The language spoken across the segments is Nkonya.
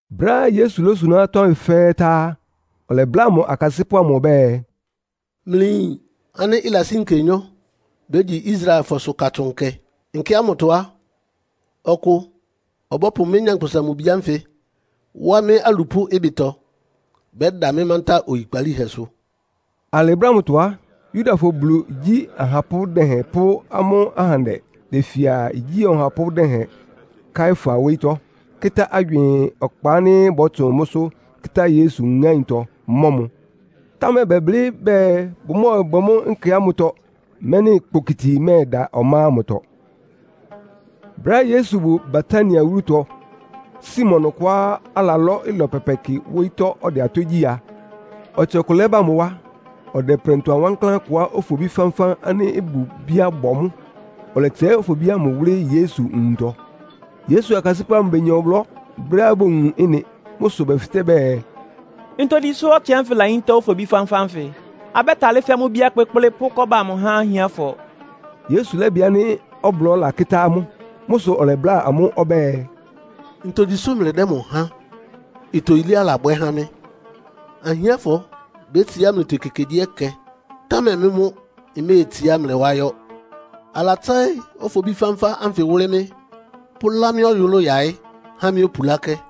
Brɛ́á Yesu lósuná atɔ́ ánfɩ fɛ́ɛ́ tá á, ɔlɛbláa mʋ akasɩ́pʋ́ amʋ ɔbɛ́ɛ, “Mlɩyin ánɩ́ ɩlasí nkenyɔ́ bégyi Israelfɔsʋ Katsʋn Nkɛ. Nkɛ ámʋtɔ á, ɔkʋ ɔbɔ́pʋ mɩ́, Nyankpʋsa-Mʋ-Bi ánfɩ wá mɩ́ alupʋ́ ɩbɩtɔ, bɛ́da mɩ́ mántá oyikpalíhɛsʋ.” Alɩ brɛ́ ámʋtɔ á, Yudafɔ Bulu igyí ahapʋ́ dɛhɛn pʋ́ amʋ́ ahandɛ befia igyí ɔhapʋ́ dɛhɛn Kaiafa wóyítɔ́, kɩ́tá agywɩɩn ɔkpa ánɩ́ bɔ́tsʋn mʋ́sʋ́ kɩ́tá Yesu ŋáintɔ, mɔ́ mʋ. Támɛ bɛblɩ́ bɛɛ bʋmɔ́ɔbwɛ mʋ́ nkɛ ámʋtɔ, mɛ́nɩ kpokiti mɛ́ɛda ɔmá ámʋtɔ. Brɛ́á Yesu bʋ Betania wúlutɔ, Simon ɔkʋá alalɔ́ ɩlɔ pɛpɛ kɩ wóyítɔ́ ɔdɛ atɔ́ gyí a, ɔtsɩ ɔkʋ lɛ́ba mʋ wá. Ɔdɛ prɛntʋa wankláán kʋá ofobí fánfán ánɩ́ ɩbʋ bíá bɔ mʋ́, ɔlɛtsɛɩ́ ofobí ámʋ wʋ́lɩ́ Yesu nwuntɔ. Yesu akasɩ́pʋ́ amʋ benya ɔblɔ́ brɛ́á bowun ɩ́nɩ. Mʋ́ sʋ bɛfɩtɛ́ bɛɛ, “Ntogyi sʋ́ ɔtsɩ ánfɩ layíntá ofobí fánfán ánfɩ? Abɛ́talɩ́ fɛ́ mʋ́ ibíá kpékplé, pʋ́ kɔ́ba amʋ há ahiánfɔ.” Yesu lɛ́bɩ ánɩ́ ɔblɔ́ lakɩ́tá amʋ́. Mʋ́ sʋ ɔlɛbláa amʋ́ ɔbɛ́ɛ, “Ntogyi sʋ́ mlɩdɛ́ mʋ háan? Ɩtɔ yilé alabwɛ́ há mɩ́. Ahiánfɔ bétsiá mlɩtɔ ekekegyíɛkɛ, támɛ mɩ́ mʋ́ mméetsiá mlɩ wá yɔ́. Alatsɛ́ɩ́ ofobí fánfán ánfɩ wʋ́lɩ́ mɩ́, pʋ́lá mɩ́ ɔyʋlʋ́ʋ yáɩ́ há mɩ́ opulákɛ́.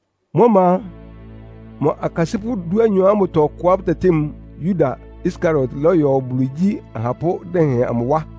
Mʋ́ ɔma a, mʋ akasɩ́pʋ́ dúanyɔ ámʋtɔ ɔkʋá bʋtɛtɩ́ mʋ Yuda Iskariot lɔ́yɔ Bulu igyí ahapʋ́ dɛhɛn amʋ wá.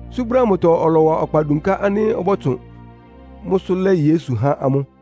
Tsú brɛ́ ámʋtɔ ɔlɔwa ɔkpa dunká ánɩ́ ɔbɔ́tsʋn mʋ́sʋ́ lɛ́ Yesu há amʋ́.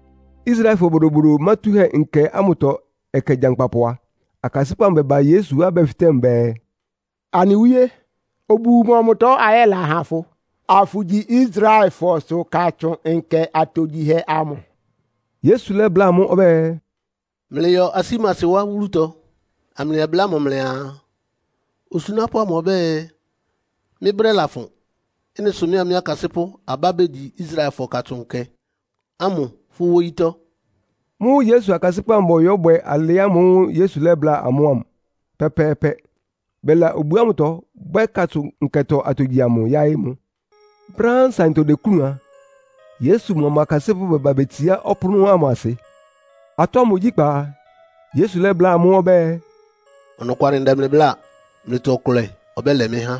Israelfɔ Bodobodo Mátúhɛ́Nkɛ ámʋtɔ ɛkɛ gyankpapʋ a, akasɩ́pʋ́ amʋ bɛba Yesu wá bɛfɩtɛ́ mʋ bɛɛ, “Anɩ Wíé, obu mɔmʋtɔ ayɛla ha fʋ, afʋgyi Israelfɔsʋ Katsʋn Nkɛ atogyihɛ amʋ?” Yesu lɛ́bláa amʋ́ ɔbɛ́ɛ, “Mlɩyɔ asímasi wá wúlutɔ, amlɩyɛbláa mʋ mlɩaa, ‘Osunápʋ́ amʋ ɔbɛ́ɛ, mɩ́ brɛ́ lafʋn. Ɩ́nɩ sʋ mɩ́a mɩ́ akasɩ́pʋ́ abá begyi Israelfɔsʋ Katsʋn Nkɛ ámʋ fʋ́ wóyítɔ́.’” Mʋ́ sʋ akasɩ́pʋ́ amʋ bɔyɔ́bwɛ alɩ ámʋ́ʋ́ Yesu lɛ́bláa amʋ́ ámʋ pɛ́pɛ́ɛ́pɛ́. Bɛla obu ámʋtɔ, bwɛ́ Katsʋn Nkɛtɔ atogyihɛ amʋ yáɩ́ ɩnʋ. Brɛ́á nsaɩntɔ deklúun a, Yesu mʋa mʋ akasɩ́pʋ́ bɛba betsiá ɔpʋ́nʋ́ ámʋ asɩ. Atɔ́ ámʋ ogyíkpá a, Yesu lɛ́bláa amʋ́ ɔbɛ́ɛ, “Ɔnɔkwalɩ ndɛ mlɩ bláa, mlɩtɔ ɔkʋlɛ ɔbɛ́lɛ mɩ́ há.”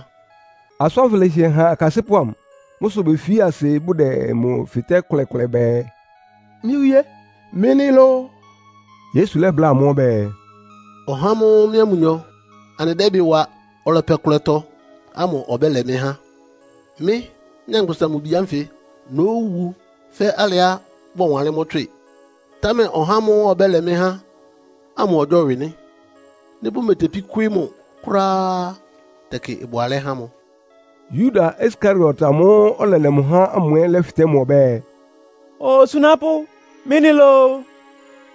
Asʋ́n ánfɩ lɛ́hɩɛ han akasɩ́pʋ́ amʋ. Mʋ́ sʋ befi asɩ bʋdɛ mʋ fɩtɛ́ kʋlɛkʋlɛ bɛɛ, “Mɩ́ Wíé, mɩ́ nɩ́ lóó?” Yesu lɛ́bláa amʋ́ ɔbɛ́ɛ, “Ɔhá ámʋ́ʋ́ mɩ́a mʋnyɔ anɩdɛ́ ɩbɩ wa ɔlɛpɛ ɔkʋlɛtɔ ámʋ ɔbɛ́lɛ mɩ́ há. Mɩ́, Nyankpʋsa-Mʋ-Bi ánfɩ nówu fɛ́ alɩá bɔwanlɩ́n tswɩ́ɩ, támɛ ɔhá ámʋ́ʋ́ ɔbɛ́lɛ mɩ́ há ámʋ ɔgyɔ́wɩ nɩ́. Nɩ́ bʋmetepí kwɩ́ɩ́ mʋ kʋ́ráá á, tɛkɩ ɩbʋ alɛ́ há mʋ.” Yuda Iskariot amʋ́ʋ́ ɔlɛlɛ mʋ há ámʋ ɛ́ lɛ́fɩtɛ́ mʋ ɔbɛ́ɛ, “Osunápʋ́, mɩ́ nɩ́ lóó?”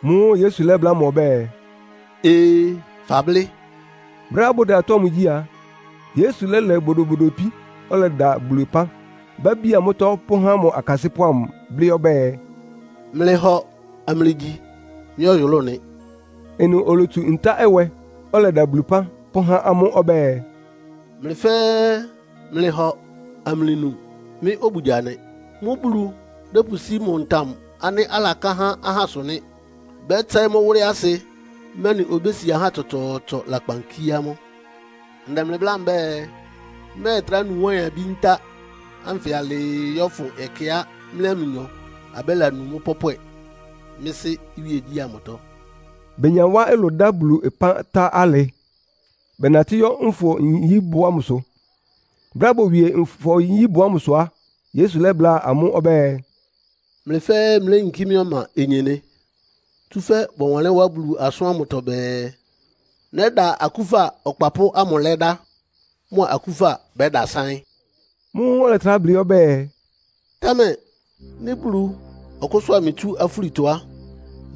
Mʋ́ʋ́ Yesu lɛ́bláa mʋ ɔbɛ́ɛ, “Ee, fablɩ́.” Brɛ́á bʋdɛ atɔ́ ámʋ gyí a, Yesu lɛ́lɛ bodobodo ipín, ɔlɛda Bulu ɩpán, bíábía mʋ́tɔ́ pʋ́há mʋ akasɩ́pʋ́ amʋ, blɩ́ ɔbɛ́ɛ, “Mlɩhɔ amlɩgyi. Mɩ́ ɔyʋlʋ́ʋ nɩ.” Ɩnʋ olotsu ntá-ɛwɛ, ɔlɛda Bulu ɩpán, pʋ́há amʋ́ ɔbɛ́ɛ, “Mlɩ fɛ́ɛ́ mlɩhɔ amlɩnu. Mɩ́ obugya nɩ. Mʋ́ Bulu dɛ́pʋsí mʋ ntam ánɩ́ alaká há ahásʋ nɩ́. Bɛ́tsɛɩ́ mʋ́ wʋ́lɩ́ asɩ, mɛ́nɩ obési ahá tsɔtsɔɔtsɔ lakpan kíé amʋ́. Ndɛ mlɩ bláa mbɛ́ɛ, mmɛ́ɛtrá nu wáɩn-abí ntá ánfɩ alɩɩ yɔ́fʋn ɛkɛá mɩ́a mlɩnyɔ abɛ́lanu mʋ́ pɔ́pwɛ mɩ́ Sɩ́ iwíegyí ámʋtɔ.” Benya wá ɩlʋ dá Bulu ɩpán tá alɩ, bɛnatɩ́ yɔ́ Nfɔ-nyíbʋ ámʋsʋ. Brɛ́á bowie Nfɔ-nyíbʋ ámʋsʋ á, Yesu lɛ́bláa amʋ́ ɔbɛ́ɛ “Mlɩ fɛ́ɛ́ mléyinkí mɩ́ ɔma onyenɩ. Tsúfɛ́ bɔwanlɩ́n wá Bulu asʋ́n ámʋtɔ bɛɛ, ‘Nɛ́da akúfa ɔkpapʋ́ ámʋ lɛ́dá, mʋ akúfa bɛ́dasáɩ́n.’” Mʋ́ʋ́ ɔlɛtrá blɩ́ ɔbɛ́ɛ, “Támɛ nɩ́ Bulu ɔkʋ́sʋ́a mɩ tsú afúlitɔ á,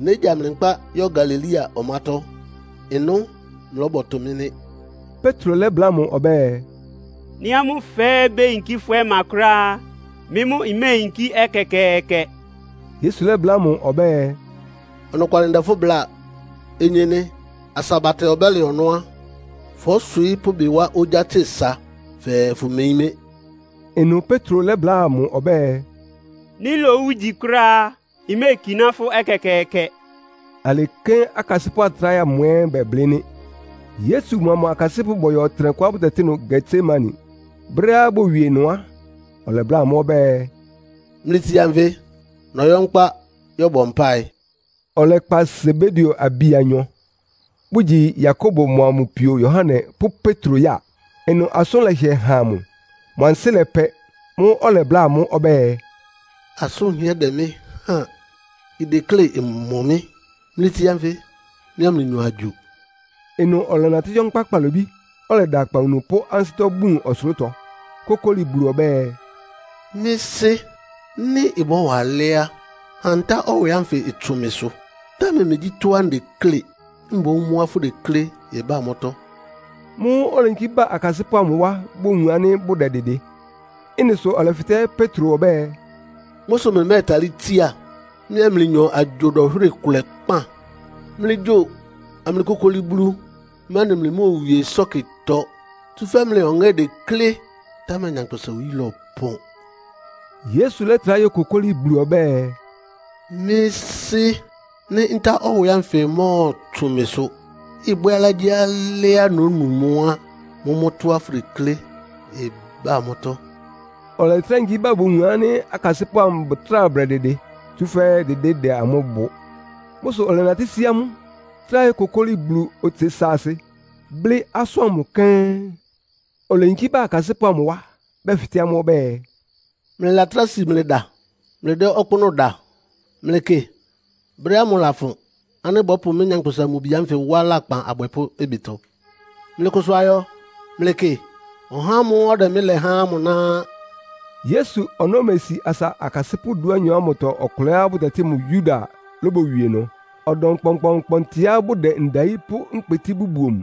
négya mlɩ nkpá yɔ́ Galilea ɔmátɔ́. Ɩnʋ mlɔ́bɔtʋ mɩ́ nɩ́.” Petro lɛ́bláa mʋ ɔbɛ́ɛ, “Nɩ́ amʋ́ fɛ́ɛ́ beyinkí fʋ́ ɔma kʋ́ráá á, mɩ́ mʋ́ mméeyinkí ɛkɛkɛɛkɛ.” Yesu lɛ́bláa mʋ ɔbɛ́ɛ, “Ɔnɔkwalɩ ndɛ fʋ́ bláa. Onyenɩ, asa batɛ ɔbɛ́lɛ ɔnɔ́ á, fɔ́swɩɩ́ pʋ́ ɩbɩ wá ogyá tse sa fɛɛ fʋmeyín mɩ́.” Ɩnʋ Petro lɛ́bláa mʋ ɔbɛ́ɛ, “Nɩ́ lowu ígyi kʋ́ráá á, mméekiná fʋ́ ɛkɛkɛɛkɛ.” Alɩ kɛ́n akasɩ́pʋ́ atráhɛ amʋ ɛ́ bɛblɩ́ nɩ́. Yesu mʋa mʋ akasɩ́pʋ́ bɔyɔ ɔtɩnɛkʋá bʋtɛtɩ́ ɩnʋ Getsemane. Brɛ́á bowie ɩnʋ á, ɔlɛbláa amʋ́ ɔbɛ́ɛ, “Mlɩtsia nfɩ, nɔyɔ́ nkpá yɔ́bɔ mpáɩ.” Ɔlɛkpa Sebedeo abi anyɔ, bʋgyi Yakobo mʋa mʋ pio Yohane pʋ́ Petro ya. Ɩnʋ asʋ́n lɛhɩɛ́ han mʋ, mʋ ansɩ́ lɛpɛ. Mʋ́ʋ́ ɔlɛbláa amʋ́ ɔbɛ́ɛ, “Asʋ́n ɩhɩ́ɛ́ dɛ mɩ́ háan, ideklé ɩmɔ mɩ́. Mlɩtsia nfɩ, mɩ́a mlɩnyɔ agyo.” Ɩnʋ ɔlɛnatɩ́ yɔ́ nkpá kpalobí, ɔlɛda akpawunu pʋ́ ansɩ́tɔ́ bun ɔsʋlʋ́tɔ, kókóli Bulu ɔbɛ́ɛ, “Mɩ́ Sɩ́, nɩ́ ɩbɔ́wa alɛ́ á, ha ntá-ɛwɛ ánfɩ ɩtsʋn mɩsʋ. Támɛ megyí tɔ́á ndeklé, mboún mʋ́á fʋdeklé ɩbá mʋ́tɔ́.” Mʋ́ʋ́ oleyinkí ba akasɩ́pʋ́ amʋ wá bowun ánɩ́ bʋdɛdɩdɩ. Ɩ́nɩ sʋ ɔlɛfɩtɛ́ Petro ɔbɛ́ɛ, “Mʋ́ sʋ mlɩmɛ́talɩ́ tsíá, mɩ́a mlɩnyɔ agyo dɔnhwɩ́rɩ kʋlɛ kpán? Mlɩgyo amlɩkokoli Bulu, mɛ́nɩ mlɩmóowie ɩsɔ́kɩtɔ, tsúfɛ́ mlɩ ɔŋɛ́ deklé, támɛ nyankpʋsa-oyí lɔpɔn.” Yesu lɛ́trá yókokóli Bulu ɔbɛ́ɛ, “Mɩ́ Sɩ́, nɩ́ ntá-ɛwɛ ánfɩ mɔ́ɔtsʋn mɩsʋ, ɩbwɛ́ alɩágyíalɩ́á nónu mʋ́ á, mʋ́mʋ́ tɔ́á fʋdeklé ɩbá mʋ́tɔ́.” Ɔlɛtrá yinkí ba bowun ánɩ́ akasɩ́pʋ́ amʋ bʋtráa bʋdɛdɩdɩ, tsúfɛ́ dɩdɩ́ dɛ amʋ́ bʋ. Mʋ́ sʋ ɔlɛnatɩ́ sí amʋ́, trá yókokóli Bulu otse saasɩ, blɩ́ asʋ́n ámʋ kɛ́n. Oleyinkí ba akasɩ́pʋ́ amʋ wá, bɛfɩtɛ́ amʋ́ ɔbɛ́ɛ, “Mlɩlatráa si mlɩda mlɩdɛ́ ɔkpʋ́nʋ́ da? Mlɩkɩ, brɛ́ ámʋ lafʋn ánɩ́ bɔ́pʋ mɩ́, Nyankpʋsa-Mʋ-Bi ánfɩ wá lakpan abwɛpʋ́ ɩbɩtɔ. Mlɩkʋsʋ ayɔ. Mlɩkɩ, ɔhá ámʋ́ʋ́ ɔdɛ mɩ́ lɛ há ámʋ ná á.” Yesu ɔnɔ́ mesi asa akasɩ́pʋ́ dúanyɔ ámʋtɔ ɔkʋlɛá bʋtɛtɩ́ mʋ Yuda lóbowie ɩnʋ. Ɔdɔm kpɔnkpɔɔnkpɔntɩá bʋdɛ ndayí pʋ́ nkpotí bʋbuo mʋ.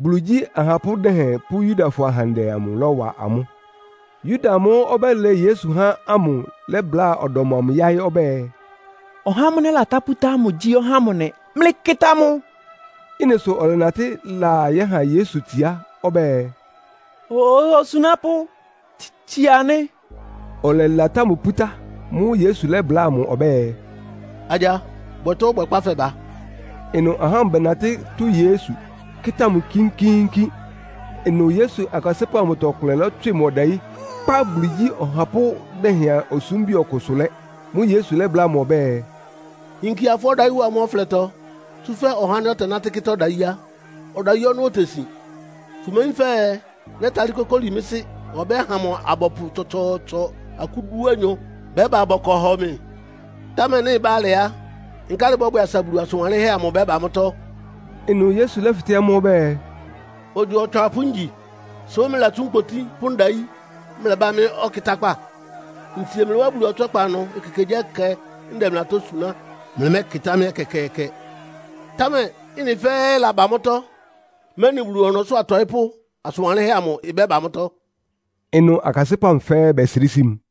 Bulu igyí ahapʋ́ dɛhɛn pʋ́ Yudafɔ ahandɛ amʋ lɔ́wa amʋ́. Yuda amʋ́ʋ́ ɔbɛ́lɛ Yesu há ámʋ lɛ́bláa ɔdɔm amʋ yáɩ́ ɔbɛ́ɛ, “Ɔhá ámʋ́ʋ́ nɛ́latá pútá ámʋ gyí ɔhá ámʋ nɩ. Mlɩkɩta mʋ.” Ɩ́nɩ sʋ ɔlɛnatɩ́ laa yɛ́ha Yesu itsiá ɔbɛ́ɛ, “Osunápʋ́, tsia nɩ́!” Ɔlɛlatá mʋ pútá. Mʋ́ʋ́ Yesu lɛ́bláa mʋ ɔbɛ́ɛ, “Agya, bwɛ tɔ́á ɔbwɛkpá fɛba.” Ɩnʋ ahá ámʋ bɛnatɩ́ tʋ́ Yesu, kɩ́tá mʋ kínkíínkín. Ɩnʋ Yesu akasɩ́pʋ́ amʋtɔ ɔkʋlɛ lɔ́tswɩ mʋ ɔdayí, kpá Bulu igyí ɔhapʋ́ dɛhɛn osúmbi ɔkʋ ɩsʋ lɛ́. Mʋ́ʋ́ Yesu lɛ́bláa mʋ ɔbɛ́ɛ, “Yinkia fʋ́ ɔdayí wa mʋ́ ɔflɛtɔ. Tsúfɛ́ ɔhá ánɩ́ ɔtɛnátɩ́ kɩ́tá ɔdayí á, ɔdayí ɔnɔ́ otesin. Fʋmeyín fɛɛ nɛ́talɩ́ kókóli mɩ́ Sɩ́ ɔbɛ́ha mʋ abɔpʋ tsɔtsɔɔtsɔ akú dúanyɔ bɛ́ba bɔkɔ hɔ mɩ? Támɛ nɩ́ ɩbá alɩ á, nkálɩ ɩbɔ́bwɛ asa Bulu asʋn wanlɩ́nhɛ́ amʋ ɩbɛ́ba mʋ́tɔ́?” Ɩnʋ Yesu lɛ́fɩtɛ́ amʋ́ ɔbɛ́ɛ, “Ogyo otswapʋ́ ngyi, sʋ́ mlɩlatsú nkpotí pʋ́ ndayí mlɛbá mɩ́ ɔkɩtákpá? Ntsie mlɩ wá Bulu ɔtswɛ́kpa ɩnʋ ekekegyíɛkɛ ndɛ mlɩ atɔ́ suná, mlɩmɛ́kɩtá mɩ́ ɛkɛkɛɛkɛ. Támɛ ɩ́nɩ fɛ́ɛ́ laba mʋ́tɔ́, mɛ́nɩ Bulu ɔnɔ́sʋ́ atɔɩ́pʋ́ asʋ́n wanlɩ́nhɛ́ amʋ ɩbɛ́ba mʋ́tɔ́.” Ɩnʋ akasɩ́pʋ́ amʋ fɛ́ɛ́ bɛsrɩ́ sí mʋ.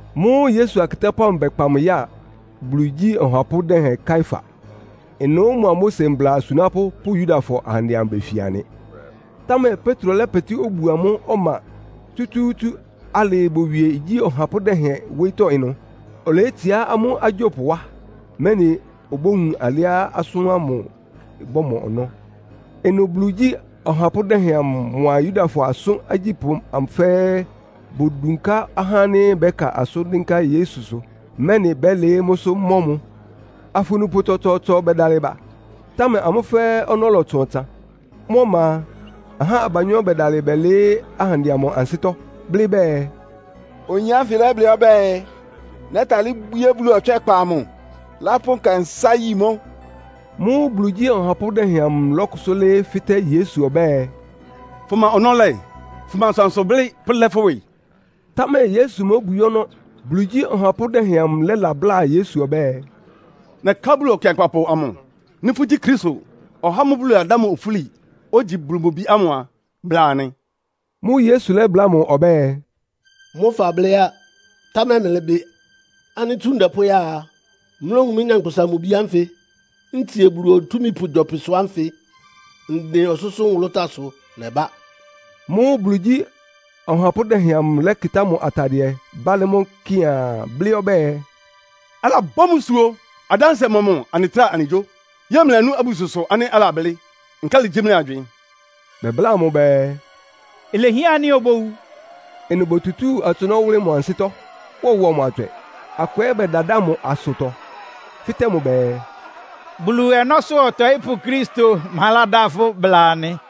Mʋ́ʋ́ Yesu akɩtápʋ́ amʋ bɛkpa mʋ ya Bulu igyí ɔhapʋ́ dɛhɛn Kaiafa. Ɩnʋ́ mʋa Mose mbla asunápʋ́ pʋ́ Yudafɔ ahandɛ amʋ befia nɩ. Támɛ Petro lɛ́pɛtɩ́ obuo amʋ́ ɔma tsútsúútsú alɩɩ bowie igyí ɔhapʋ́ dɛhɛn wóyítɔ́ ɩnʋ. Oleyétsiá amʋ́ agyópʋ wá, mɛ́nɩ obówun alɩá asʋ́n ámʋ ɩbɔ́mɔ ɔnɔ́. Ɩnʋ Bulu igyí ɔhapʋ́ dɛhɛn amʋ mʋa Yudafɔ asʋ́n agyípʋ́ amʋ fɛ́ɛ́ bodunká ahá ánɩ́ bɛ́ka asʋ́n dɩ́nká Yesusʋ, mɛ́nɩ bɛ́lɩɩ́ mʋ́sʋ́ mɔ́ mʋ. Afunupʋ tsɔtsɔɔtsɔ bɛdalɩ ba, támɛ amʋ́ fɛ́ɛ́ ɔnɔ́ lɔtsʋn ɔtsan. Mʋ́ ɔma a, ahá abanyɔ́ bɛdalɩ bɛlɩɩ́ ahandɛ amʋ ansɩ́tɔ́, blɩ́ bɛɛ, “Oyin ánfɩ lɛ́blɩ́ ɔbɛ́ɛ, ‘Nɛ́talɩ́ bwíé Bulu ɔtswɛ́kpa amʋ, lápʋ́ nkɛnsá yi mʋ́.’” Mʋ́ʋ́ Bulu igyí ɔhapʋ́ dɛhɛn amʋ lɔ́kʋsʋ́ lɩ́ɩ́ fɩ́tɛ́ Yesu ɔbɛ́ɛ, “Fʋma ɔnɔ́ lɛ́? Fʋma asʋansʋ blɩ́ pʋ́lɛ́ fʋ́ ɩwɩ?” Támɛ Yesu móbwií ɔnɔ́. Bulu igyí ɔhapʋ́ dɛhɛn amʋ lɛ́labláa Yesu ɔbɛ́ɛ, “Nɛká Bulu Ɔkɩankpapʋ amʋ, nɩ́ fʋ́gyí Kristo, (ɔhá ámʋ́ʋ́ Bulu ladá mʋ ofúli), ogyi Bulu mʋ Bi ámʋ a, bláa anɩ.” Mʋ́ʋ́ Yesu lɛ́bláa mʋ ɔbɛ́ɛ, “Mʋ́ fablɩ́ á. Támɛ mlɩbɩ ánɩ́ tsú ndɛ pʋ́ya a, mlówun mɩ́, Nyankpʋsa-Mʋ-Bi ánfɩ ntsie Bulu Otúmípʋ gyɔpɩsʋ ánfɩ, ndɩn ɔsʋ́sʋ́ nwʋlʋ́táasʋ nɛbá.” Mʋ́ʋ́ Bulu igyí ɔhapʋ́ dɛhɛn amʋ lɛ́kɩtá mʋ atadɩɛ bálɩ́ mʋ́ kɩaan, blɩ́ ɔbɛ́ɛ “Alabɔ́ mbusuo! Adánsɩɛ mɔmʋ anɩtráa anɩgyó? Yɛ́ɛ mlɩlanú abususʋ ánɩ́ alablɩ́. Nkálɩ gyí mlɩ agywɩɩn?” Bɛbláa mʋ bɛɛ, “Ilehián ánɩ́ obówu!” Ɩnʋ botutúu atsʋnɔ́ wʋlɩ́ mʋ ansɩ́tɔ́, wɔwɔ mʋ atswɛ. Akʋ ɛ́ bɛdadáa mʋ asʋtɔ, fɩ́tɛ́ mʋ bɛɛ, “Bulu ɔnɔ́sʋ́ ɔtɔɩ́pʋ́ Kristo, ma ládá fʋ́? Bla anɩ.”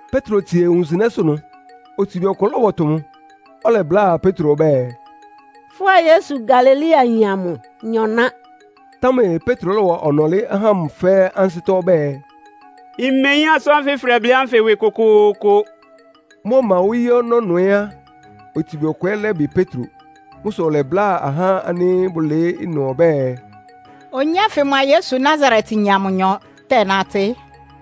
Petro tsie wunsɩnɛ́sʋ́ ɩnʋ, otsibi ɔkʋ lɔ́bɔtʋ mʋ. Ɔlɛbláa Petro ɔbɛ́ɛ, “Fʋ́a Yesu Galileayin amʋ nyɔ ná.” Támɛ Petro lɔ́wa ɔnɔlɩ́ ahá ámʋ fɛ́ɛ́ ansɩ́tɔ́ ɔbɛ́ɛ, “Mmeyín asʋ́n ánfɩ fʋdɛblɩ́ ánfɩ ɩwɩ kʋkʋʋkʋ.” Mʋ́ ɔma wóyí ɔnɔ́ ɩnʋ ɛ́ á, otsibi ɔkʋ ɛ́ lɛ́bɩ Petro. Mʋ́ sʋ ɔlɛbláa ahá ánɩ́ bʋlɩɩ́ ɩnʋ ɔbɛ́ɛ, “Oyin ánfɩ mʋa Yesu Nasaretyin amʋnyɔ tɛ́nátɩ́.”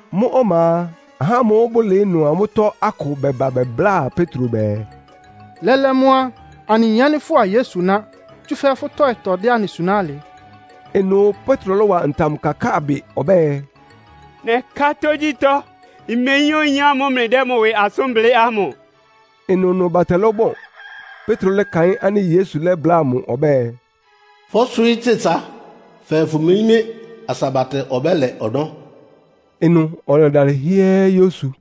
Mʋ́ ɔma a, ahá ámʋ́ʋ́ bʋlɩɩ́ ɩnʋ ámʋtɔ akʋ bɛba bɛbláa Petro bɛɛ, “Lɛ́lɛ́ mʋ́ á, anɩyin ánɩ́ fʋ́a Yesunyɔ ná, tsúfɛ́ fʋ́ tɔ́ɩtɔ dɛ anɩ suná alɩ.” Ɩnʋ Petro lɔ́wa ntam kakáa bɩ ɔbɛ́ɛ, “Nɛká tógyítɔ́, mmeyín oyin ámʋ́ʋ́ mlɩdɛ́ mʋ ɩwɩ asʋ́n blɩ́ ámʋ!” Ɩnʋnʋ batɛ lɔ́bɔn. Petro lɛ́kaɩ́n ánɩ́ Yesu lɛ́bláa mʋ ɔbɛ́ɛ, “Fɔ́swɩɩ́ tse sa fɛɛ fʋmeyín mɩ́ asa batɛ ɔbɛ́lɛ ɔnɔ́.” Ɩnʋ ɔlɛdalɩ hɩ́ɛ́ yósu.